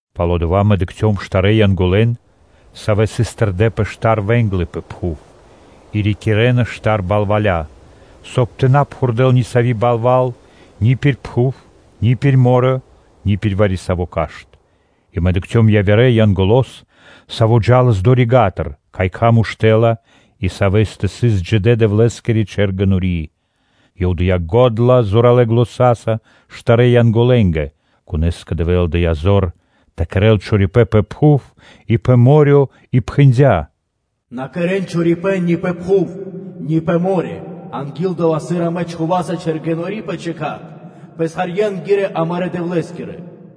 Пало́ дава́ мэ дыкхцём штарэ́ Янголэн, Савэ сыс тэрдэ́ пэ штар вэ́нглы пэ пхув и рикирэнас штар балваля, соб (кай) тэ на пхурдэл ни сави́ балва́л ни пир пхув, ни пир мо́рё (дэрья́в), ни пир вари-саво́ кашт (дрэ́во). И мэ дыкхцём явирэ Янголо́с, Саво́ джа́лас долэ́ рига́тыр, кай кхам уштэ́ла и савэ́стэ сыс Джидэ́-Дэвлэ́скири чэргэнори́. Ёв дыя́ го́дла зоралэ́ заня́са штарэ́ Янголэнгэ, конэ́скэ Дэвэ́л дыя́ зор тэ кэрэ́л чорипэ́н пэ пхув и пэ мо́рё (дэрья́в) и пхэндя́: “На кэрэ́н чорипэ́н ни пэ пхув, ни пэ мо́рё (дэрья́в), анги́л дова́, сыр амэ чхуваса чэргэнори́ пэ чэкат писхарье́нгэ Амарэ́ Дэвлэ́скирэ.”